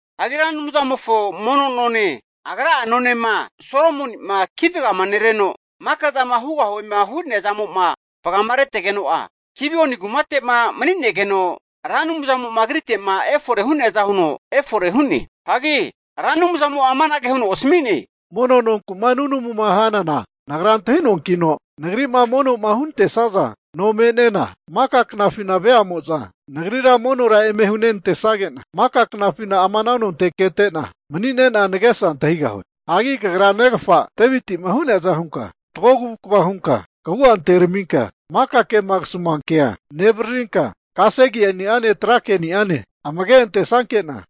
Hagi Ra Anumzamofo mono none, agra'a nonema Solomoni'ma ki vaganereno, maka zama hugahuema hu'nea zamo'ma vagamaretegeno'a, Gibioni kumate'ma mani'negeno Ra Anumzamo'ma agrite'ma efore hu'neaza huno efore hu'ne. Hagi Ra Anumzamo'a anage huno asami'ne, Mono nonku'ma nunamuma hanana Nagra antahi'noankino Nagri'ma mono'ma hunantesaza no me'nena maka knafina veamo'za Nagrira monora eme hunenantesage'na, maka knafina ama ana nonte navua kete'na mani'nena nagesa antahigahue. Hagi kagra negafa Deviti'ma hu'neaza hunka fatgo kavukva hunka kagu'a anteraminka, maka kema kasamua kea nevaririnka kasegeni'ane, trake'ni'ane amage'ma antesanke'na,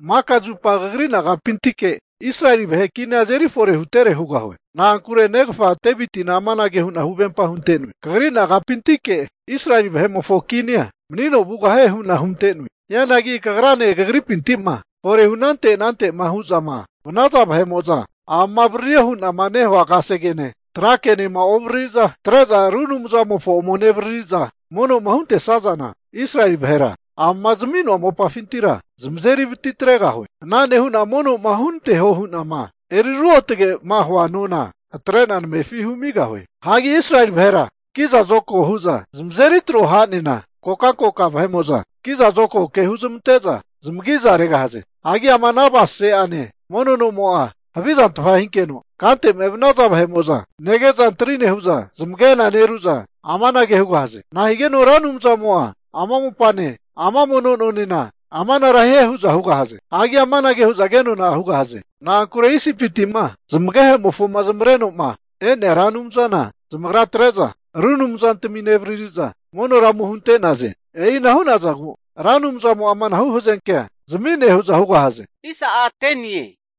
maka zupa kagri nagapintike Israeli vahe kinia azeri fore hutere hugahue. Na'ankure negafa Devitina amanage hu'na huvempa hunte'noe. Kagri nagapintike Israeli vahe'mofo kinia manino vugahie hu'na hunte'noe. Hianagi kagrane kagripinti'ma forehu anante anante'ma hu'zama vanaza vahe'mo'za amama avaririo hu'nama nehua kasegene, tra kenema ovaririza atre'za ru anumzamofo ome nevariri'za mono'ma huntesazana, Israeli vahera amama zami'noa mopafintira zamazeri vati atregahue. Ana nehu'na mono hunanteho hu'nama eri ruotge'ma hua mono nona atre'na namefi humigahue. Hagi Israeli vahera kiza zokago hu'zanknaza zamazeri tro ha'nena, kokankoka vahe'mo'za kizazokago ke huzmante'za zamagiza regahaze. Hagi ama avasase'ane mono nomo'a havizantfa hinkeno, kante'ma evanaza vahe'mo'za nege'za antri nehu'za, zamagena neru'za amanage hugahaze, nahigeno Ra Anumzamo'a ama mopane, ama mono nonena amanara hie hu'za hugahaze. Hagi amanage hu'za kenona hugahaze, na'ankure Isipiti'ma zamagehe'mofoma zamavareno'ma e'nea Ra Anumzana zamagra atre'za, ru anumzantami nevaririza monora ome hunte'naze. E'ina hu'nazagu Ra Anumzamo'a amanahu hazenkea zami'ne hu'za hugahaze.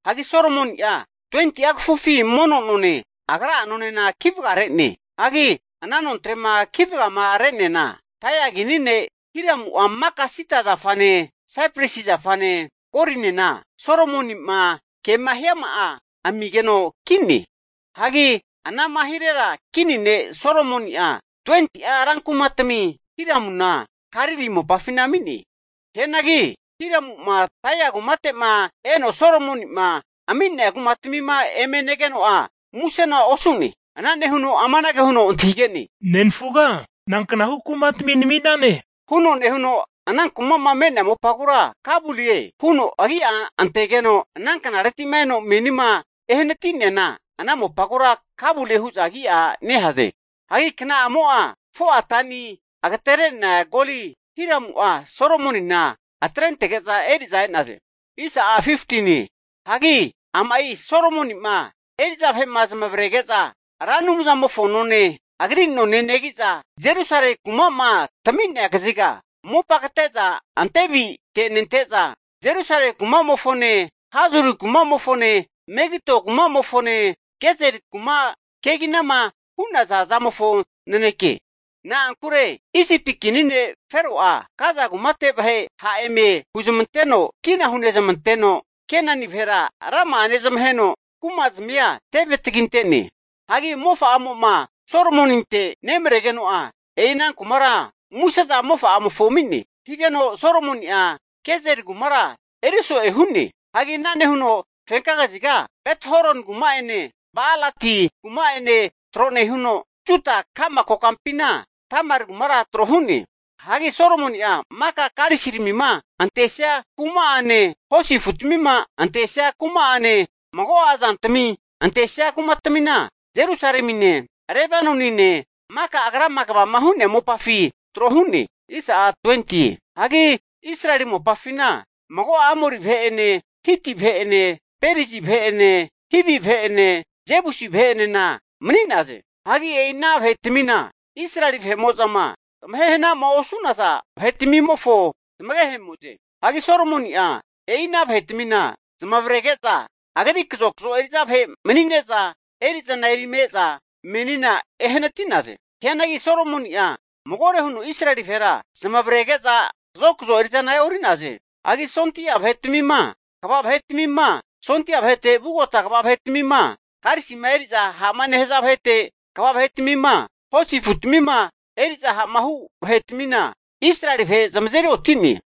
Hagi Solomoni'a 20'a kafufi mono none agra'a nonena kivagare'ne. Hagi ana nontrema ki vagamare'neana, Tairi kini ne' Hiramu'a maka sida zafane saipresi zafane, golinena Solomoni'ma kema hiama'a amigeno ki'ne. Hagi ana'ma hirera kini ne' Solomoni'a 20'a rankumatmi Hiramuna Galili mopafina ami'ne. Hianagi Hiramu'ma Tairi kumateti'ma eno Solomoni'ma ami'nea kumatmima eme negeno'a, musena osu'ne. Ana nehuno amanage huno antahige'ne? Nenfuga nanknahu kumatmi namine? huno nehuno ana kuma'ma me'nea mopagura Kabulie (eri'zama'a omne'ne) huno agia antegeno, ana knareti'ma eno menima ehanati'neana ana mopagura Kabulie hu'za agi'a nehaze. Hagi kna'amo'a 4'a tani agatere'nea goli Hiramu'a Solomonina atrentege'za eri'za e'naze. Hagi ama'i Solomoni'ma eri'za vahe'ma zamavarege'za Ra Anumzamofo none, agri none negi'za Jerusalemi kuma'ma tami'nea kaziga mopa kate'za ante avite'nente'za, Jerusalemi kuma'mofone Hazori kumamofone, Megido kuma'mofone Gezeri kuma keginama hu'naza zamofo naneke. Na'ankure Isipi kini ne' Fero'a Gaza kumate vahe ha' eme huzmanteno kina hunezmanteno, Kenani vahera rama'a nezamaheno, kumazmia teve taginte'ne. Hagi mofa'amo'ma Solomoninte nemaregeno'a, e'i ana kumara muse'za mofa'amofo ami'ne. Ana higeno Solomoni'a Gezeri kumara eriso'e hu'ne. Hagi ana nehuno fenka kaziga Bet-horoni kuma'ene, Ba'alati kuma'ene tro nehuno, Juda ka'ma kokampina Tamari kumara tro hu'ne. Hagi Solomoni'a maka karisiramima antesia kuma'ane, hosi afutmima antesia kuma'ane, mago'a zantmi antesia kumatmina Jerusalemine, Lebanonine maka agrama kegavama hu'nea mopafi tro hu'ne. Hagi Israeli mopafina mago'a Amori vahe'ene Hiti vahe'ene Perizi vahe'ene Hivi vahe'ene Jebusi vahe'enena mani'naze. Hagi e'ina vahetamina Israeli vahe'mo'zama zamahe hanama osu'naza vahe'tmimofo zamagehemo'ze. Hagi Solomoni'a e'ina vahetmina zamavarege'za, agri kazokazo eri'za vahe manine'za eri'zana erime e'za menina ehanati'naze. Hianagi Solomoni'a magore huno Israeli vahera zamavarege'za kazokazo eri'zana e'ori'naze. Hagi sondia vahetmima, kva vahe'tmima, sondia vahete vugota kva vahetmima, karisima eri'za ha'ma nehaza vahete kva vahetmima, hosi afutmima eri'za ha'ma hu vahe'tmina Israeli vahera zamazeri oti'ne.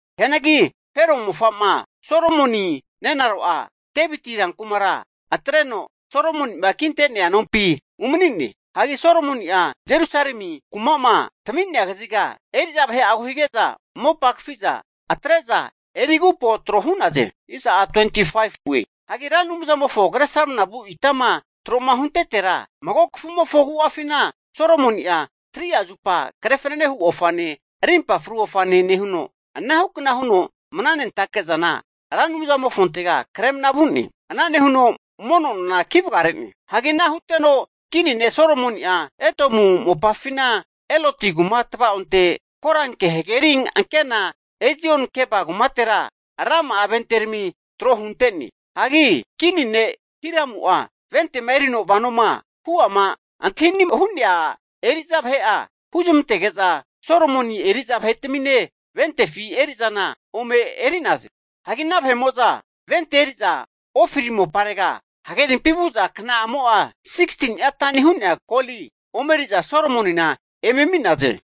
Hianagi Fero mofa'ma Solomoni nenaro'a Deviti rankumara atreno, Solomoni'ma kintea nompi umani'ne. Hagi Solomoni'a Jerusalemi kuma'ma tami'nea kaziga eri'za vahe'agu hige'za, mopa kafi'za atre'za eri agupo tro hu'naze. Hagi Ra Anumzamofo kresramna vu itama tro'ma huntetera mago kafumofo agu'afina Solomoni'a 3'a zupa kre fananehu ofane, arimpa fru ofanena nehuno, anahukna huno mnanentake'zana Ra Anumzamofontega kremna vu'ne. Ana nehuno mono nona ki vagare'ne. Hagi ana huteno kini ne' Solomoni'a Edomu mopafina Eloti kuma tava'onte, Koranke hageri ankena, Ezion-gebe kumatera rama'a venterami tro hunte'ne. Hagi kini ne' Hiramu'a ventema erino vanoma hu'ama antahini'ma hu'naza eri'za vahe'a huzmantege'za Solomoni eri'za vahe'tamine ventefi erizana ome eri'naze. Hagi ana vahe'mo'za vente eri'za Ofiri moparega hagerimpi vu'za kna'amo'a 16ni'a tani hu'nea goli omeri'za Solomonina eme ami'naze.